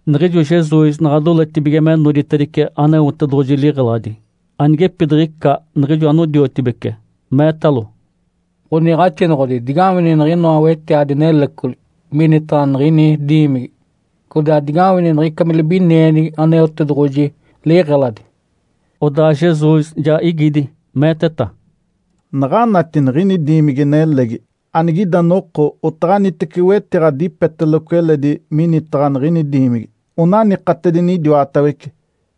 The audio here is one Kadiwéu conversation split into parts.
Niɡ̶ijo Jesus naɡ̶a doletedibige me noditedice Aneotedoɡ̶oji liɡ̶eladi, anigepidiɡ̶ica niɡ̶ijo anodiotibece meetalo, “Ǥoniiɡ̶axinoɡ̶odi, digawini niɡ̶inoa wetiadi nelecoli minitaɡ̶a niɡ̶ini diimigi! Codaa digawini niɡ̶ica me libinienigi Aneotedoɡ̶oji liɡ̶eladi!” Odaa Jesus ja igidi, meeteta, “Naɡ̶anati niɡ̶ini diimigi-nelegi? Anigida noko otaɡ̶anitece wetiɡ̶a dipeteloco eledi minitaɡ̶a niɡ̶ini diimigi, onanikatedini idiwatawece.”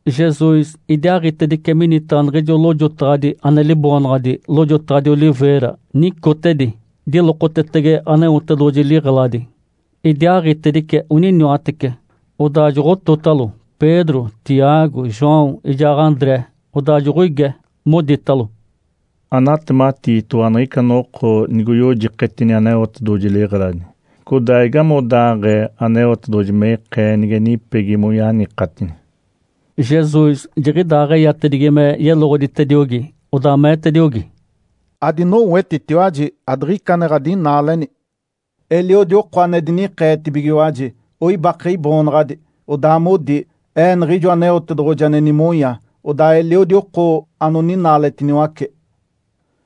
Jesus idiaaɡ̶itedice minitaɡ̶a niɡ̶ijo lojotaɡ̶adi ane liboonaɡ̶adi “Lojotaɡ̶adi Oliveira” nicotedi, dilokotetege Aneotedoɡ̶oji liɡ̶eladi. Idiaaɡ̶itedice oniniwatece, odaa joɡ̶ototalo Pedro, Tiago, João ijaa André. Odaa joɡ̶oige, moditalo, “Anatematiitoɡ̶owa niɡ̶ica noko nigoyojiketini Aneotedoɡ̶oji liɡ̶eladi. Codaa igamigodaaɡ̶ee Aneotedoɡ̶oji me ikee nige nipegi moyanikatini?” Jesus jiɡ̶idaaɡ̶eyatedigi me yeloɡ̶oditediogi, odaa meetediogi, “Adinowetitiwaji adiɡ̶ica ane ɡ̶adinaaleni! Eliodi oko ane dinikeetibigiwaji, oibake Iboonaɡ̶adi, odaa modi, ‘Ee Niɡ̶ijo Aneotedoɡ̶oji ane nimonya.’ Odaa eliodi oko anoninaaletiniwace.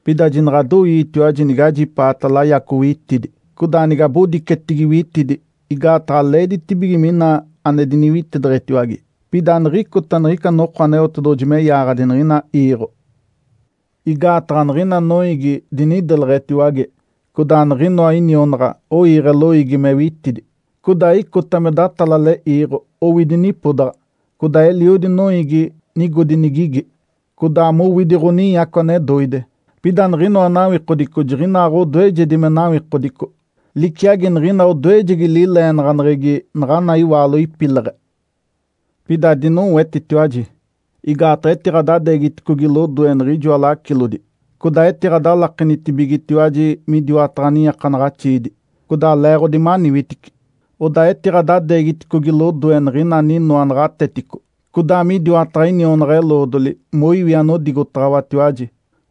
Pida jinaɡ̶adoiitiwaji nigajipaata layaco witidi, codaa nigabodicetigi witidi, igaataɡ̶a leeditibige mina ane diniwitideɡ̶etiwage. Pida aniɡ̶icota niɡ̶ica noko Aneotedoɡ̶oji me yaaɡ̶adi niɡ̶ina iiɡ̶o. Igaataɡ̶a niɡ̶ina noiigi dinideleɡ̶etiwage, codaa niɡ̶inoa inionaɡ̶a oiiɡ̶e loiigi me witidi. Codaa icota me datalale iiɡ̶o owidi nipodaɡ̶a, codaa eliodi noiigi nigodi nigigi, codaa mowidi ɡ̶oninyaco ane doide. Pida niɡ̶inoa nawikodico jiɡ̶inaaɡ̶odoejedi me nawikodico liciagi niɡ̶ina odoejegi lileenaɡ̶aneɡ̶egi naɡ̶ana iwaalo ipileɡ̶e. Pida adinowetitiwaji, igaataɡ̶a etiɡ̶adadeegiticogi lodoe niɡ̶ijoa lacilodi, codaa etiɡ̶adalakenitibigetiwaji midiwataɡ̶a niiakanaɡ̶axiidi. Codaa leeɡ̶odi maniwitici, odaa etiɡ̶adadeegiticogi lodoe niɡ̶ina aninoa naɡ̶atetico codaa midiwataɡ̶a inionaɡ̶a-eloodoli moiwi anodigotaɡ̶awatiwaji.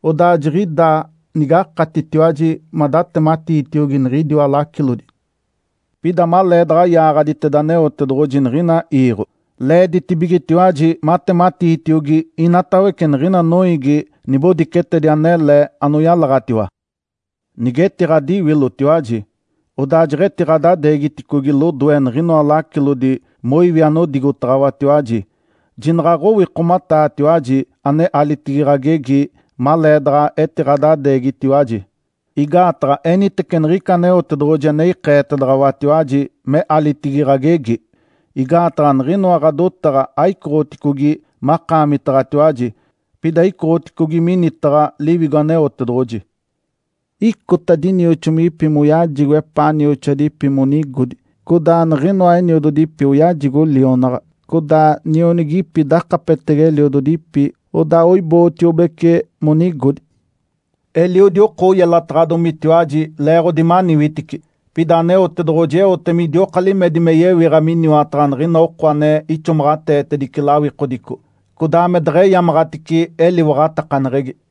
Odaa jiɡ̶idaa nigakatitiwaji madatematiitiogi niɡ̶idiwa lacilodi. Pida maleedaɡ̶a yaaɡ̶aditeda Aneotedoɡ̶oji niɡ̶ina iiɡ̶o, leeditibigetiwaji matematiitiogi inatawece niɡ̶ina noiigi nibodicetedi anele anoyalaɡ̶atiwa. Nige etiɡ̶adiwilotiwaji, odaa jeɡ̶etiɡ̶adadeegiticogi lodoe niɡ̶inoa lacilodi moiwi anodigotaɡ̶awatiwaji, jinaɡ̶a aɡ̶owikomataatiwaji ane alitigi ɡ̶agegi maleedaɡ̶a etiɡ̶adadeegitiwaji. Igaataɡ̶a enitece niɡ̶ica Aneotedoɡ̶oji ane ikeetedaɡ̶awatiwaji me alitigi ɡ̶agegi. Igaataɡ̶a niɡ̶inoa ɡ̶adotaɡ̶a aicoɡ̶oticogi makaamitaɡ̶atiwaji, pida icoɡ̶oticogi minitaɡ̶a Liwigo Aneotedoɡ̶oji. Icota dinioxomigipi moyajigo epaa nioxoadipi monigodi, codaa niɡ̶ina eniododipi oyajigo lionaɡ̶a, codaa nionigipi dakapetege eliododipi, odaa oibootiobece monigodi. Eliodi oko oyelataɡ̶adomitiwaji leeɡ̶odi maniwitici. Pida Aneotedoɡ̶oji eote midioka limedi me yewiɡ̶a miniwataɡ̶a niɡ̶ina oko ane ixomaɡ̶ateetedice lawikodico, codaa me deɡ̶eyamaɡ̶atice eliwaɡ̶atakaneɡ̶egi.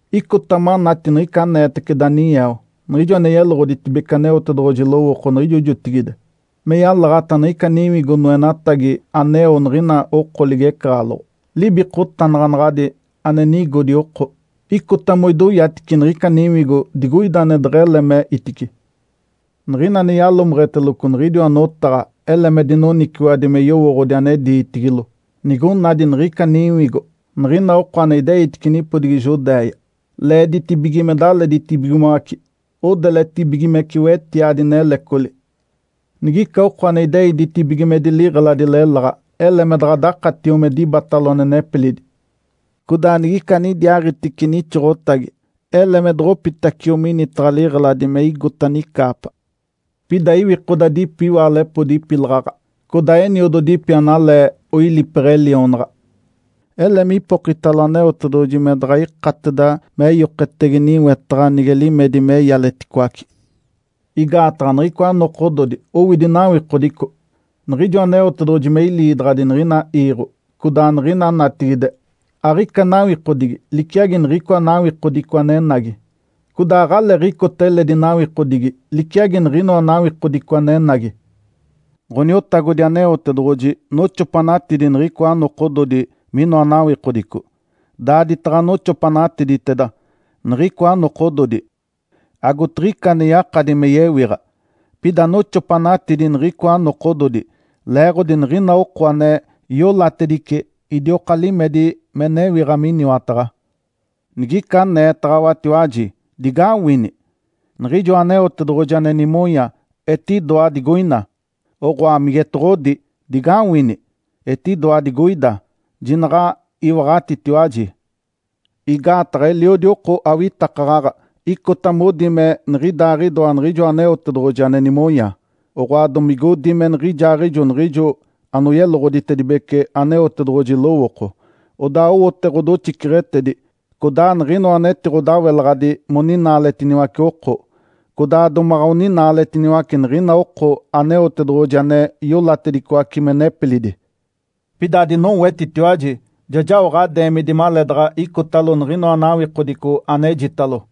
Icota manati niɡ̶ica aneetece Daniel, niɡ̶ijo ane yeloɡ̶oditedibece Aneotedoɡ̶oji lowooko niɡ̶ijo jotigide, me yalaɡ̶ata niɡ̶ica niwigo noenatagi aneo niɡ̶ina oko ligecaɡ̶aloɡ̶o, libikotanaɡ̶anaɡ̶adi ane nigodi oko. Icota moidoyatice niɡ̶ica niwigo digoida ane deɡ̶ele me itice. Niɡ̶ina ane yalomeɡ̶eteloco niɡ̶idiwa notaɡ̶a ele me dinoniciwaɡ̶adi me yowooɡ̶odi ane diitigilo. Nigonadi niɡ̶ica niwigo, niɡ̶ina oko ane ideitice nipodigi Judéia leeditibige me daleditibigimoace odeletibigimece wetiadi nelecoli. Nigica oko ane idei ditibigimedi liɡ̶eladi leláɡ̶a, ele me daɡ̶adakatio me dibatalo ane nepilidi. Codaa nigica anidiaaɡ̶itice nixoɡ̶otagi ele me doɡ̶opitacio minitaɡ̶a liɡ̶eladi me igota nicaapa. Pida iwikodadipi iwaalepodi ipilaɡ̶aɡ̶a codaa eniododipi analee oilipeɡ̶e lionaɡ̶a! Ele mipokitalo Aneotedoɡ̶oji me daɡ̶a ikateda meyoketege niwetaɡ̶a nige limedi me ialeticoace. Igaataɡ̶a niɡ̶icoa nokododi owidi nawikodico. Niɡ̶ijo Aneotedoɡ̶oji me iliidaɡ̶adi niɡ̶ina iiɡ̶o codaa niɡ̶ina natigide aɡ̶ica nawikodigi liciagi niɡ̶icoa nawikodico anenagi. Codaa aɡ̶aleeɡ̶icota eledi nawikodigi liciagi niɡ̶inoa nawikodico anenagi. Ǥoniotagodi Aneotedoɡ̶oji noxopanatidi niɡ̶icoa nokododi minoa nawikodico. Daaditaɡ̶a noxopanatiditeda niɡ̶icoa nokododi, agotiɡ̶ica ane yakadi me yewiɡ̶a. Pida noxopanatidi niɡ̶icoa nokododi leeɡ̶odi niɡ̶ina oko ane iolatedice idioka limedi me newiɡ̶a miniwataɡ̶a. Nigica aneetaɡ̶awatiwaji, ‘Digawini! Niɡ̶ijoa Aneotedoɡ̶oji ane nimonya etidoa digoina!’ oɡ̶oa migetoɡ̶odi, ‘Digawini! Etidoa digoida!’ Jinaɡ̶a iwaɡ̶atitiwaji. Igaataɡ̶a eliodi oko awitakaɡ̶aɡ̶a icota modi me niɡ̶idaaɡ̶idoa Niɡ̶ijoa Aneotedoɡ̶oji ane nimonya, oɡ̶oa domigodi me niɡ̶ijaaɡ̶ijo niɡ̶ijo anoyeloɡ̶oditedibece Aneotedoɡ̶oji lowooko. Odaa owote ɡ̶odoxiceɡ̶etedi, codaa niɡ̶inoa anetiɡ̶odawelaɡ̶adi moninaaletiniwace oko. Codaa domaɡ̶a oninaaletiniwace niɡ̶ina oko Aneotedoɡ̶oji ane iolatedicoace me nepilidi. Pida adinowetitiwaji! Ja jao ɡ̶adeemidi maleedaɡ̶a icotalo niɡ̶inoa nawikodico anejitalo.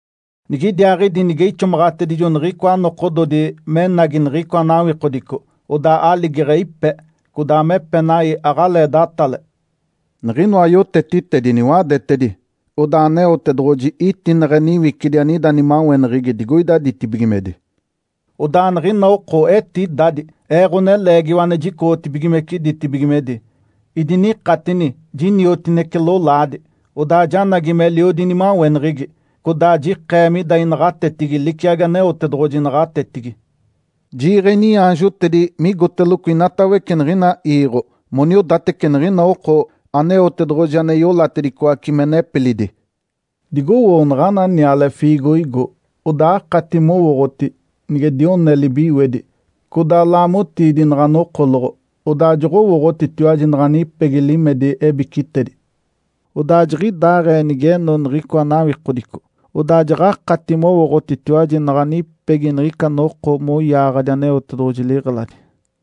Nigidiaaɡ̶idi, nige ixomaɡ̶atedijo niɡ̶icoa nokododi menagi niɡ̶icoa nawikodico, odaa aligeɡ̶e ipe, codaa me epenai aɡ̶alee datale. Niɡ̶inoa yotetitedi niwadetedi. Odaa Aneotedoɡ̶oji itineɡ̶e niwicidi anida nimaweneɡ̶egi digoida ditibigimedi. Odaa niɡ̶ina oko etidadi Ee, Ǥoneleegiwa ane jicoɡ̶otibigimece ditibigimedi. Idinikatini jiniotinece lolaadi, odaa janagi meliodi inimaweneɡ̶egi, codaa jikee mida inaɡ̶atetigi liciagi Aneotedoɡ̶oji naɡ̶atetigi. Jiiɡ̶e iniaanjotedi migoteloco inatawece niɡ̶ina iiɡ̶o moniodatece niɡ̶ina oko Aneotedoɡ̶oji ane iolatedicoace me nepilidi. Digowoo naɡ̶ana niale fiigoigo, odaa akati mowooɡ̶oti. Nige dione libiwedi, codaa laamotiidi naɡ̶a nokoloɡ̶o, odaa joɡ̶owooɡ̶otitiwaji naɡ̶a nipegi limedi ebicitedi. Odaa jiɡ̶idaaɡ̶ee nigeno niɡ̶icoa nawikodico, odaa jaɡ̶akati mowooɡ̶otitiwaji naɡ̶a nipegi niɡ̶ica noko moyaaɡ̶adi Aneotedoɡ̶oji liɡ̶eladi.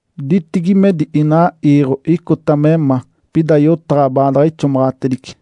Ditibigimedi inaa iiɡ̶o icota me ma, pida yotaɡ̶a baadaɡ̶a ixomaɡ̶atedice.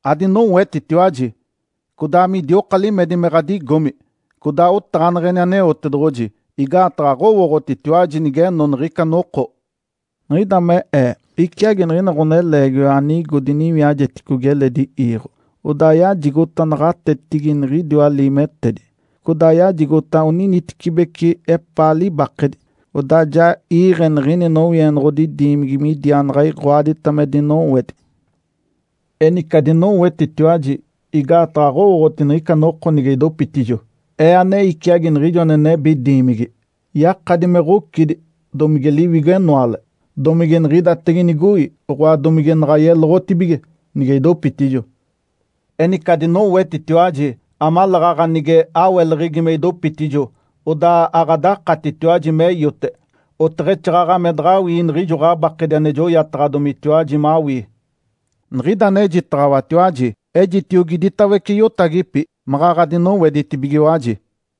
Adinowetitiwaji, codaa midioka limedi me ɡ̶adigomi codaa otaɡ̶aneɡ̶eni Aneotedoɡ̶oji igaataɡ̶a aɡ̶owooɡ̶otitiwaji nigeno niɡ̶ica noko. Niɡ̶ida me Ee iciagi niɡ̶ina ɡ̶oneleegiwa anigo diniwiajeticogi eledi iiɡ̶o. Odaa yajigota naɡ̶atetigi niɡ̶idiwa liimetedi, codaa yajigota oninitecibeci epaa libakedi. Odaa ja iiɡ̶e niɡ̶ini nowienoɡ̶odi diimigi midiaanaɡ̶a iɡ̶oadita me dinowedi. Enice, adinowetitiwaji, igaataɡ̶a aɡ̶owooɡ̶oti niɡ̶ica noko nige idopitijo, Ee, ane iciagi niɡ̶ijo ane nebi diimigi. Yakadi me ɡ̶ocidi, domige liwigo-enoale, domige niɡ̶idatege nigoi, oɡ̶oa domige naɡ̶a yeloɡ̶otibige, nige idopitijo. Enice adinowetitiwaji amaleeɡ̶aɡ̶a nige aweleɡ̶egi me idopitijo, odaa aɡ̶adakatitiwaji me iote, oteɡ̶exaaɡ̶aɡ̶a me daɡ̶awii niɡ̶ijo ɡ̶abakedi ane joyataɡ̶adomitiwaji mawii. Niɡ̶ida anejitaɡ̶awatiwaji, ejitiogi iditawece iotagipi, maɡ̶aɡ̶a dinoweditibigiwaji!”